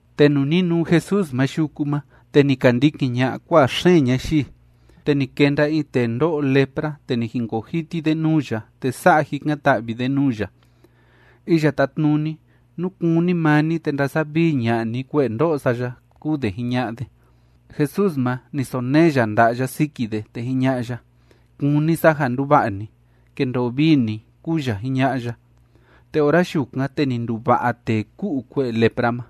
Te nuu ni nuu Jesús ma yuku ma, te ni ka ndikin ña'a kua'a xeen ñayii. Te ni kenda in tee ndó'o lepra, te ni jinkoo jiti de nuu ya, te sa'a jikan‑ta'vi de nuu ya: ―Iya Tátnuni, nú kúni maa ni, te ndasavii ña'a ni kue'e ndó'o sa ya ―kúu de jiña'a de. Jesús ma, ni sonee ya nda'a ya siki de, te jiña'a ya: ―Kúni sa ja nduva'a ni. ¡Kendoo vii ni! ―kúu ya jiña'a ya. Te ora yukan, te ni nduva'a tee ku'u kue'e lepra ma,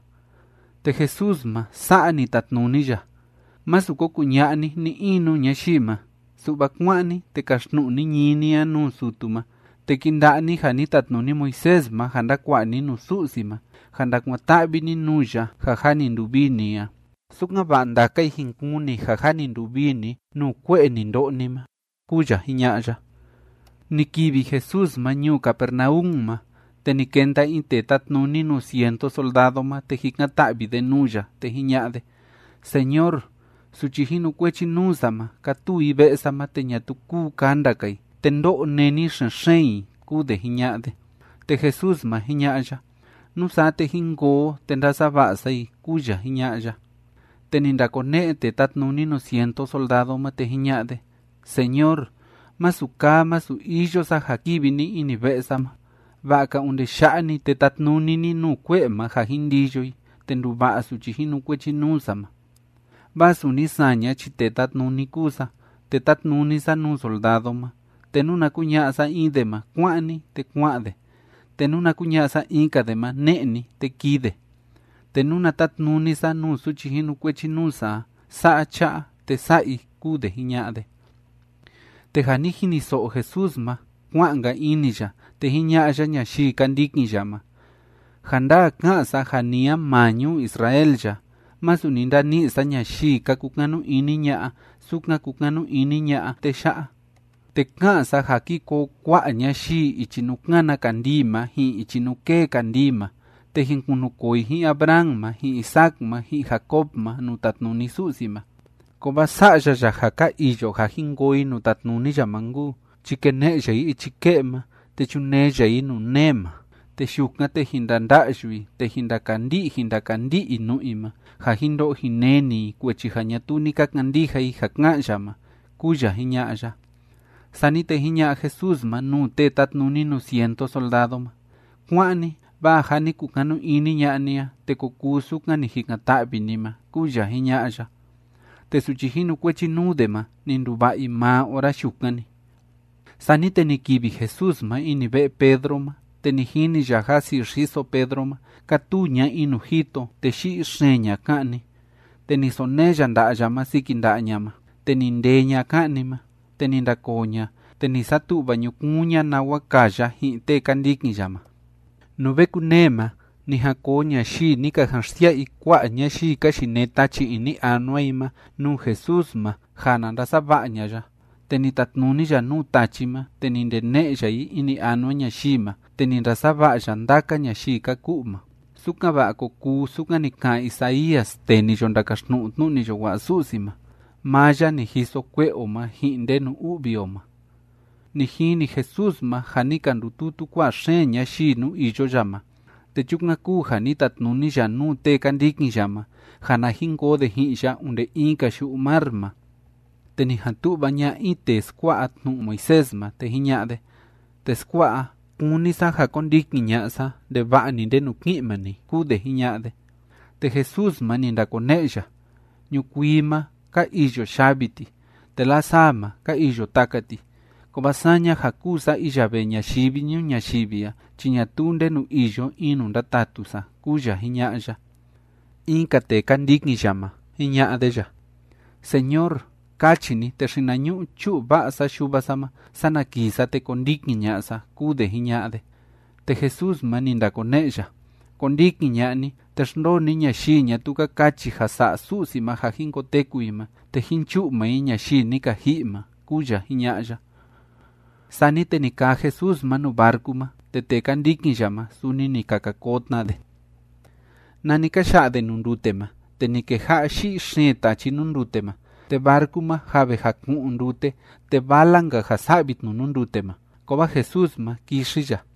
te Jesús ma, sa'a ni tatnuni ya: ―Másu ko kuña'a ni ni‑in nuu ñayii ma, su'va kuá'an ni, te kaxtnu'u ni ñií ni a nuu sutu ma, te kinda'a ni ja ni tatnuni Moisés ma ja ndakua'a ni nuu Su'si ma ja ndakuan‑ta'vi ni nuu ya ja jâ ni nduvii ni a, sukan‑va'a ndaka i jin kuni ja jâ ni nduvii ni nuu kue'e ni ndo'o ni ma ―kúu ya jiña'a ya. Ni kivi Jesús ma ñuu Capernaum ma, te ni kenda in tee tátnuni nuu cientu soldado ma, te jikan‑ta'vi de nuu ya, te jiña'a de: ―Señor, suchi jinukuechi nuu sa ma, kátuu i ve'e sa ma, te ñatuu kúu kanda‑ka i, te ndó'o néni xen‑xeen i ―kúu de jiña'a de. Te Jesús ma, jiña'a ya: ―Nusaa, te jín koo o, te ndasava'a sa i ―kúu ya jiña'a ya. Te ni ndakone'e tee tátnuni nuu cientu soldado ma, te jiña'a de: ―Señor, masu kaa masu iyo sa ja kivi ni ini ve'e sa ma. Va'a‑ka onde ya'a‑ni te tatnuni ni nuu kue'e ma ja jin ndiyo i, te nduva'a suchi jinukuechi nuu sa ma. Vaa suni saña chi tee tátnuni kúu sa, te tátnuni sa nuu soldado ma. Te nuna kuña'a sa in de ma: “Kuá'an ni”, te kua'an de, te nuna kuña'a sa in‑ka de ma: “Ne'e ni”, te kii de. Te nuna tátnuni sa nuu suchi jinukuechi nuu sa a: “Sa'a cha'a”, te sa'a i ―kúu de jiña'a de. Te ja ni jiniso'o Jesús ma, kua'an‑nka ini ya, te jiña'a ya ñayii ka ndikin ya ma: ―Ja ndaa ká'an sa ja ni a maa ñuu Israel ya, masu ni ndani'i sa ñayii ka kukanu ini ña'a sukan kúkanu ini ña'a tee ya'a. Te ká'an sa ja ki koo kua'a ñayii ichi nuu kána kandii ma ji'in ichi nuu kée kandii ma, te jin kunukoo i ji'in Abraham ma ji'in Isaac ma ji'in Jacob ma nuu tatnuni Su'si ma. Kovaa sa'ya ya ja ka iyo ja jin koo i nuu tatnuni ya ma nkuu, chi kene'e ya i ichi ke'e ma, te chunee ya i nuu nee ma, te yukan, te jin ndanda'yu i, te jin ndakandi'i jin ndakandi'i i nu'u i ma ja jin ndo'o jin neni i kuechi ja ñatuu ni ka kandija i ja ká'an ya ma ―kúu ya jiña'a ya. Sani te jiña'a Jesús ma nuu tee tátnuni nuu cientu soldado ma: ―Kuá'an ni. Vaa ja ni kukanu ini ña'a ni a, te ko kuu sukan ni jikan‑ta'vi ni ma ―kúu ya jiña'a ya. Te suchi jinukuechi nuu de ma, ni nduva'a i maa ora yukan‑ni. Sani te ni kivi Jesús ma ini ve'e Pedro ma, te ni jini ya ja si'i xiso Pedro ma, kátuu ña in nuu jito, te yi'i xeen ña'a ka'ni. Te ni sonee ya nda'a ya ma siki nda'a ña ma, te ni ndee ña'a ka'ni ma, te ni ndakoo ña, te ni satu'va ñukuun ña nawa kaa ya ji'in tee ka ndikin ya ma. Nuu ve kunee ma, ni jan koo ñayii ni ka jan xsia'a i kua'a ñayii ka yinee tachi ini anua i ma, nuu Jesús ma, ja na ndasava'a ña'a ya. Te ni tatnuni ya nuu tachi ma, te ni ndene'e ya i ini anua ñayii ma, te ni ndasava'a ya ndaka ñayii ka ku'u ma, sukan‑va'a ko kuu sukan ni ka'an Isaías tee ni yo ndakaxtnu'u tnu'u ni yo wa'a Su'si ma: “Maa ya ni jiso kue'e o ma ji'in ndenu u'vi o ma.” Ni jini Jesús ma ja ni ka ndututu kua'a xeen ñayii nuu iyo ya ma, te chukan kúu ja ni tatnuni ya nuu tee ka ndikin ya ma ja na jin koo de ji'in ya onde in‑ka yu'u mar ma. Te ni jan tu'va ña'a in tee skua'a tnu'u Moisés ma, te jiña'a de: ―Teskua'a, kúni sa ja kondikin ña'a sa ndeva'a‑ni ndenu ki'in maa ni ―kúu de jiña'a de. Te Jesús ma, ni ndakone'e ya: ―Ñukuii ma, ka iyo yavi ti, te lasaa ma, ka iyo taka ti, kovaa saña ja kúu sa iya vee ñayivi ñuu ñayivi a chi ñatuu ndenu iyo in nuu ndatatu sa ―kúu ya jiña'a ya. In‑ka tee ka ndikin ya ma, jiña'a de ya: ―Señor, kachi ni, te xinañu'u chu'u va'a sa yuva sa ma, sana kii sa, te kondikin ña'a sa ―kúu de jiña'a de. Te Jesús ma, ni ndakone'e ya: ―Kondikin ña'a ni, te xndoo ni ñayii ñatuu ka kachi ja sa'a Su'si ma ja jin koteku i ma, te jin chu'u maa i ñayii ni ka ji'i ma ―kúu ya jiña'a ya. Sani te ni kaa Jesús ma nuu barcu ma, te tee ka ndikin ya ma, suni ni ka ka koo tna de. Nani ka ya'a de nuu ndute ma, te ni keja'a yi'i xeen tachi nuu ndute ma, te barcu ma jâ ve jaku'un ndute, te vala‑nka ja sa'vi tnu nuu ndute ma. Kovaa Jesús ma, kixi ya.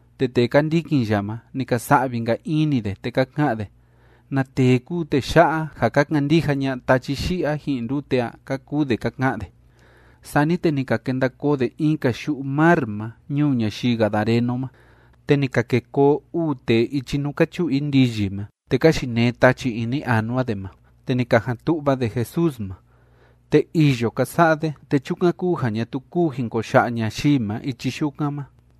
Te tee ka ndikin ya ma, ni ka sa'vi‑nka ini de, te ka ka'an de: ―¿Na tee kúu tee ya'a, ja ka kandija ña'a tachi yi'i a ji'in ndute a? ―ka kuu de ka ka'an de. Sani te ni ka kenda koo de in‑ka yu'u mar ma ñuu ñayii gadareno ma. Te ni ka ke koo uu tee ichi nuu ka chu'u i ndiyi ma, te ka yinee tachi ini anua de ma, te ni ka jan tu'va de Jesús ma. Te îyo ka sa'a de, te chukan kúu ja ñatuu kúu jin ko ya'a ñayii ma ichi yukan ma.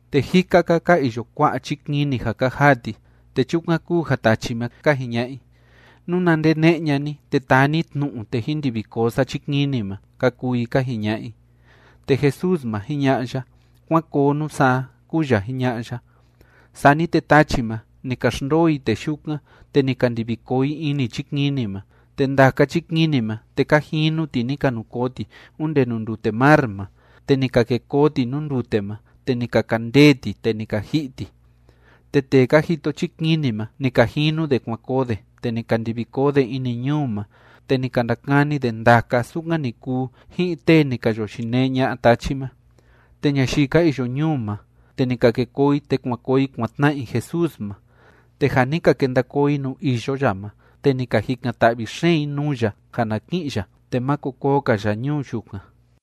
Te jika‑ka ka iyo kua'a chikini ja ka jaa ti, te chukan kúu ja tachi ma, ka jiña'a i: ―Nuna ndene'e ña'a ni, te taa ni tnu'u, te jin ndivi koo sa chikini ma ―ka kuu i ka jiña'a i. Te Jesús ma, jiña'a ya: ―¡Kuán koo, nusaa! ―kúu ya jiña'a ya. Sani te tachi ma, ni ka xndoo i tee yukan, te ni ka ndivi koo i ini chikini ma, te ndaka chikini ma, te ka jinu ti ni ka nu koo ti onde nuu ndute mar ma, te ni ka kê koo ti nuu ndute ma, te ni ka kandee ti, te ni ka ji'i ti. Te tee ka jito chikini ma, ni ka jinu de kuan koo de, te ni ka ndivi koo de ini ñuu ma, te ni ka ndakani de ndaka sukan ni kuu ji'in tee ni ka yo yinee ña'a tachi ma. Te ñayii ka iyo ñuu ma, te ni ka ke koo i te kuan koo i kuan tna'a i Jesús ma. Te ja ni ka kenda koo i nuu iyo ya ma, te ni ka jikan‑ta'vi xeen i nuu ya ja na ki'in ya, te máko koo‑ka ya ñuu yukan.